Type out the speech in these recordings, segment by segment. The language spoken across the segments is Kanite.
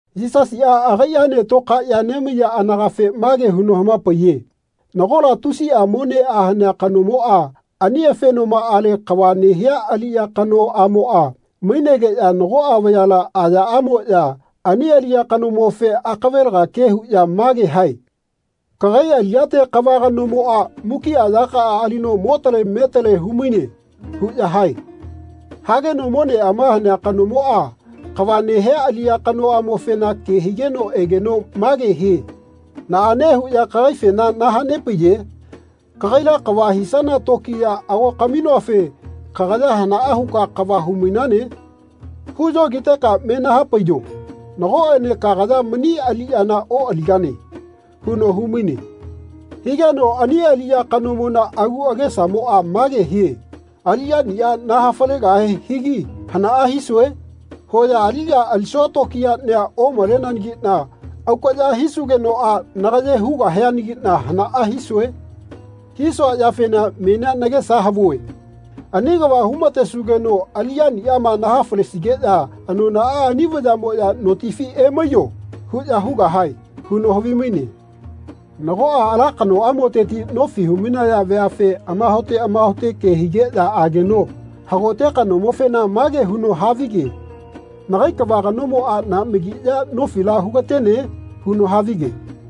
Yisasiꞌa agaiꞌaene tokaeꞌya nemaiya anagafe mage huno hamapaiye nagola tusiꞌa moneꞌa hanea kanomoꞌa ani afenomaꞌale kava nehea aliꞌya kanoꞌamoꞌa mainegeꞌya nagoꞌa vayala ayaꞌamoꞌya ani aliꞌya kanomofe akavelaga ke huꞌya mage hae “Kagai aliꞌyate kava kanomoꞌa mukiꞌa yakaꞌa alino motale metale humaine” huꞌya hae. Hageno moneꞌama hanea kanomoꞌa kava nehea aliꞌya kanoꞌamofena ke higeno egeno mage hie “Naꞌane huꞌya kagaifena nahanepaiye? Kagaila kava hisana tokiya ago kaminoafe kagaya hanaꞌa huka kava humainane? Huyogiteka menahapaiyo. Nagoꞌene kagaya mani aliꞌyana oꞌaligane.” huno humaine. Higeno ani aliꞌya kanomona agu agesamoꞌa mage hie “Aliꞌyaniꞌa nahafalegahe higi hanaꞌa hisue? Hoya aliꞌya alisua tokiyaꞌnia omaleneanagiꞌna aukaꞌya hisugenoꞌa nagaye hugahianagiꞌna hanaꞌa hisue? Hisua yafena menia nagesa havue. Ani kava humatesugeno aliꞌyaniꞌama nahafalesigeꞌya anonaꞌa ani vayaꞌmoꞌya ‘Notifi emaiyo.’ huꞌya hugahae.” huno havimaine. Nagoꞌa ala kanoꞌamoteti nofi humainaya veafe amahaote amahaote ke higeꞌya ageno hagote kanomofena mage huno havige “Nagai kava kanomoꞌa naꞌmagi ya nofila hugatene?” huno havige.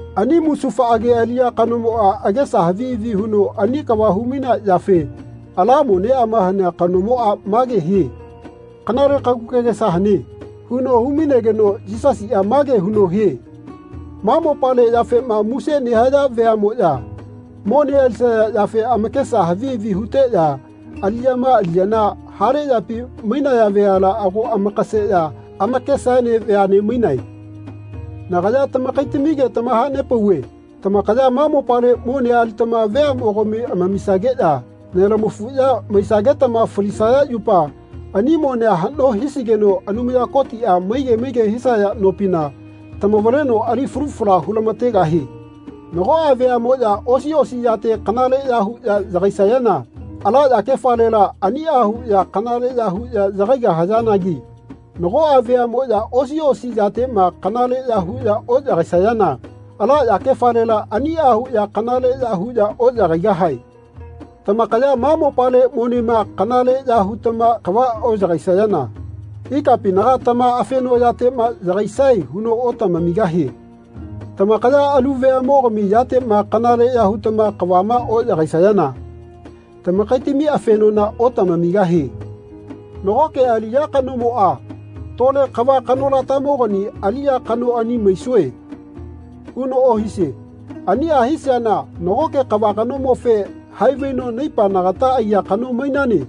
Ani musufaꞌage aliꞌya kanomoꞌa agesa havi havi huno ani kava humainea yafe ala moneꞌama hanea kanomoꞌa mage hie “Kanale kagu kagesa hane.” huno humainegeno Yisasiꞌa mage huno hie “Ma mopale yafema muse nehaya veaꞌmoꞌya mone alisaya yafe amakesa havi havi huteꞌya aliyama aliyana hale yapi mainaya veala ago amakaseꞌya amakesaene veaꞌne mainae. Nagaya tamakaitamige tamahanepauve tamakaya ma mopale monea alitama veaꞌmogami amamisageꞌya nelamafuꞌya maisagetama falisaya yupa ani monea haꞌno hisigeno Anumaya Kotiꞌa maige maige hisaya nopina tamavaleno ali falu fala hulamategahie. Nagoꞌa veaꞌmoꞌya osi osi yate kanaleꞌya huꞌya yagaisayana ala yakefalela aniꞌa huꞌya kanaleꞌya huꞌya yagaigahayanagi nagoꞌa veaꞌmoꞌya osi osi yateꞌma kanaleꞌya huꞌya oꞌyagaisayana ala yakefalela aniꞌa huꞌya kanaleꞌya huꞌya oꞌyagaigahae. Tamakaya ma mopale monema kanaleꞌya hutama kava oꞌyagaisayana ikapinaga tama afenoꞌyateꞌma yagaisae huno otamamigahie. Tamakaya alu veaꞌmogami yateꞌma kanaleꞌya hutama kavama oꞌyagaisayana tamakaitami afenona otamamigahie. Nagoke aliꞌya kanomoꞌa ‘Tole kava kanolatamogani aliꞌya kanoꞌania maisue.’ huno ohisie. Aniꞌa hisiana nagoke kava kanomofe ‘Haivaino naipa nagata aiya kano mainane.’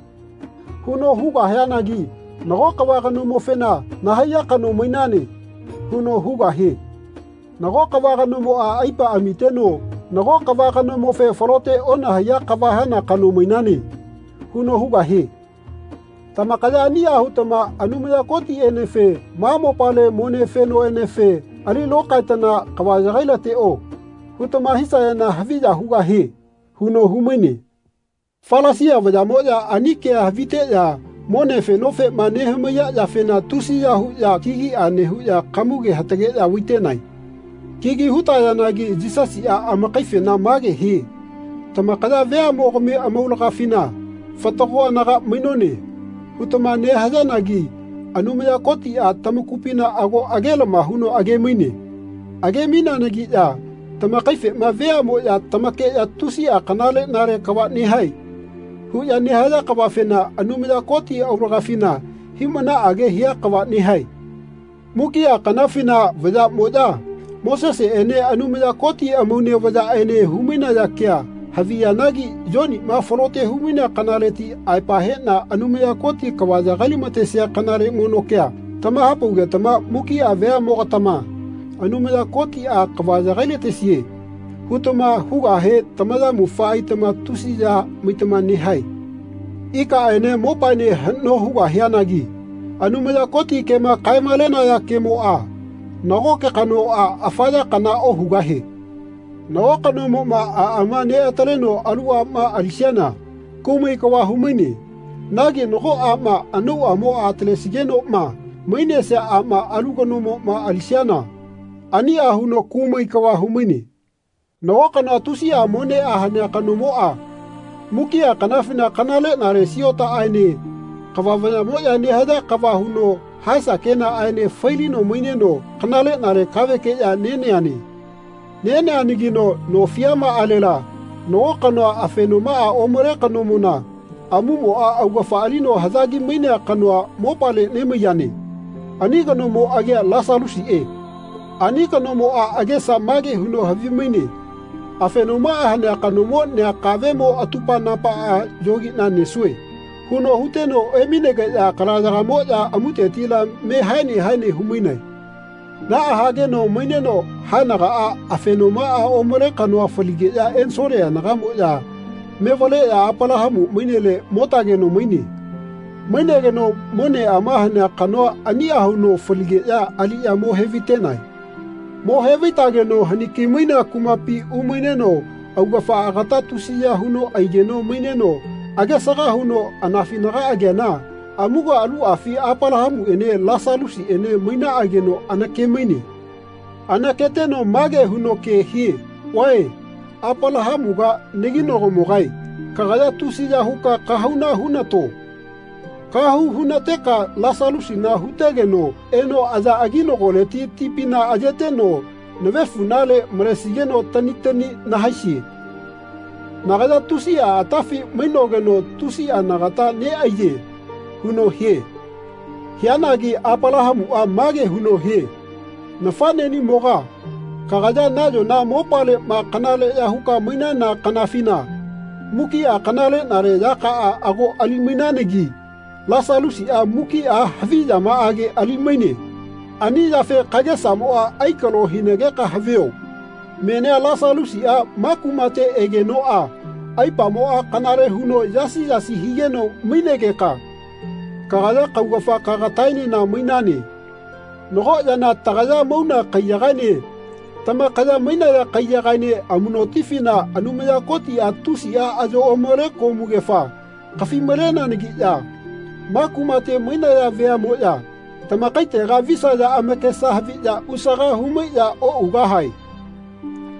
huno hugahianagi nago kava kanomofena ‘Nahaiya kano mainane.’ huno hugahie. Nago kava kanomona aipa amiteno nago kava kanomofe ‘Falote onahaiya kava hana kano mainane.’ huno hugahie. Tamakaya aniꞌa hutama Anumaya Kotiꞌenefe ma mopale mone fenoꞌenefe ‘Ali lokaetana kava yagailateꞌo.’ hutama hisayana haviya hugahie.” huno humaine. Falasia vayaꞌmoꞌya ani kea haviteꞌya mone fenofema nehamaiya yafena tusiya huꞌya kigiꞌa nehuꞌya kamuge hatageꞌya vaitenae. Kigi hutayanagi Yisasiꞌa amakaifena mage hie “Tamakaya veaꞌmogami amaulagafina ‘Fatago anaga mainone.’ hutama nehayanagi Anumaya Kotiꞌa tamakupina ago agelama huno agemaine. Age-maineanagiꞌya tamakaifema veaꞌmoꞌya tamakeꞌya ‘Tusiꞌa kanaleꞌnale kava nehae.’ huꞌya nehaya kavafena Anumaya Koti aulagafina hiꞌmanaꞌage hia kava nehae. Mukiꞌa kanafina vayaꞌmoꞌya Moseseꞌene Anumaya Koti amaune vayaꞌene humainaya kea haviyanagi Yoniꞌma falote humainea kanaleti aepa heꞌna Anumaya Koti kava yagailamatesia kanale mono kea tamahapaugetama mukiꞌa veaꞌmogatama ‘Anumaya Kotiꞌa kava yagailatesie.’ hutama hugahe tamayamufa aitama tusi ya maitama nehae. Ikaꞌene mopaene haꞌno hugahianagi Anumaya Koti kema kae-malenaya kemoꞌa nagoke kanoꞌa afa ya kanala ohugahie.” Nago kanomoꞌma aꞌama neꞌataleno alu aꞌma alisiana kumai kava humaine. Nagi nago aꞌma anauꞌamoꞌa atalesigenoꞌma mainesia aꞌma alu kanomoꞌma alisayana aniꞌa huno kumai kava humaine. Nago kanoa tusiꞌa moneꞌa hanea kanomoꞌa mukiꞌa kanafina kanaleꞌnale siotaꞌaene kava vayaꞌmoꞌya nehaya kava huno haesa kenaꞌaene failino maineno kanaleꞌnale kavekeꞌya neneane. Neneanagino no fiamaꞌalela nago kanoa afenomaꞌa omale kanomona amumoꞌa augafa alino haꞌyagi-mainea kanoa mopale nemaiyane. Ani kanomo agia Lasalusiꞌe. Ani kanomoꞌa agesa mage huno havimaine “Afenomaꞌa hanea kanomo nea kaveꞌmo atupa-napaꞌa yogiꞌna nesue.” huno huteno emainegeꞌya kalayagamoꞌya amutetila me haene haene humainae. Naꞌa hageno maineno haenagaꞌa afenomaꞌa omale kanoa faligeꞌya ensole anagaꞌmoꞌya mevaleꞌya Apalahamu mainele motageno maine. Mainegeno moneꞌama hanea kanoa aniꞌa huno faligeꞌya aliꞌya mo hevaitenae. Mo hevaitageno haniki-mainea kumapi umaineno augafa agata tusiya huno aigeno maineno agesaga huno anafinaga ageana amuga aluꞌafi Apalahamuꞌene Lasalusiꞌene mainaꞌageno anakemaine. Anaketeno mage huno ke hie “Vae Apalahamuga naginagomogae kagaya tusiya huka kahauna hunato. Kahau hunateka Lasalusina hutegeno eno aya aginagoleti tipina ayeteno navefuꞌnale malesigeno tani tani nahaisie. Nagaya tusiꞌa atafi mainogeno tusiꞌa nagata neꞌaiye.” huno hie. Hianagi Apalahamuꞌa mage huno hie “Nafaꞌneꞌnimoga kagaya nayona mopaleꞌma kanaleꞌya huka mainana kanafina mukiꞌa kanaleꞌnale yakaꞌa ago ali-mainananagi Lasalusiꞌa mukiꞌa havi yamaꞌage ali-maine. Ani yafe kagesamoꞌa aikalo hinageka havio. Menia Lasalusiꞌa ma kumate egenoꞌa aipamoꞌa kanale huno yasi yasi higeno mainegeka kagaya kaugafa kagataenena mainane. Nago yana tagaya mauna kaiyagaene tamakaya mainaya kaiyagaene amuꞌnotifina Anumaya Kotiꞌa tusiꞌa ayo omale komugefa kafi-maleneanagiꞌya ma kumate mainaya veaꞌmoꞌya tamakaitega visaya amakesa haviꞌya usaga humaiꞌya oꞌugahae.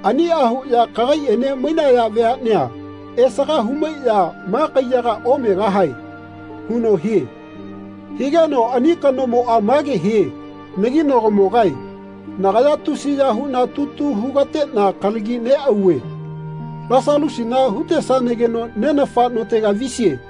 Aniꞌa huꞌya kagaiꞌene mainaya veaꞌnea esaga humaiꞌya ma kaiyaga omegahae.” huno hie. Higeno ani kanomoꞌa mage hie “Naginagomogae nagaya tusiya huꞌna tutu hugateꞌna kalagi neꞌauve. Lasalusina hutesanageno nenafa notega visie.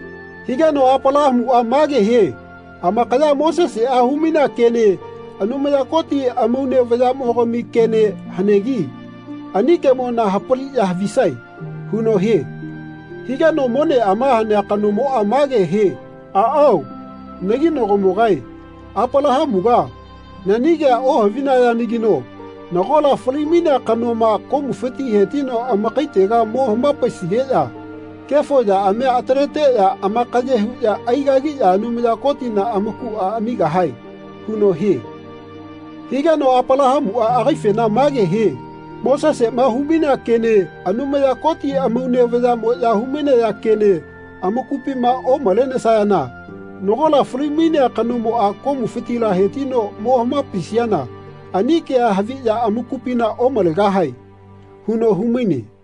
Higeno Apalahamuꞌa mage hie “Amakaya Moseseꞌa humainea kene Anumaya Koti amaune vayaꞌmogami kene hanegi ani kemona hapaliꞌya havisae.” huno hie. Higeno moneꞌama hanea kanomoꞌa mage hie “Aꞌao, naginagomogae, Apalahamuga, nani kea ohavinayanagino nagola fali-mainea kanoma komufiti hetino amakaitega mo hamapaisigeꞌya kefo yaꞌamia ataleteꞌya amakaye huꞌya aigagiꞌya Anumaya Kotina amakuꞌa amigahae.” huno hie. Higeno Apalahamuꞌa agaifena mage hie “Moseseꞌma humainea kene Anumaya Koti amaune vayaꞌmoꞌya humainaya kene amakupima omalenesayana nagola fali-mainea kanomoꞌa komufitila hetino mo hamapaisiana ani kea haviꞌya amakupina omalegahae.” huno humaine.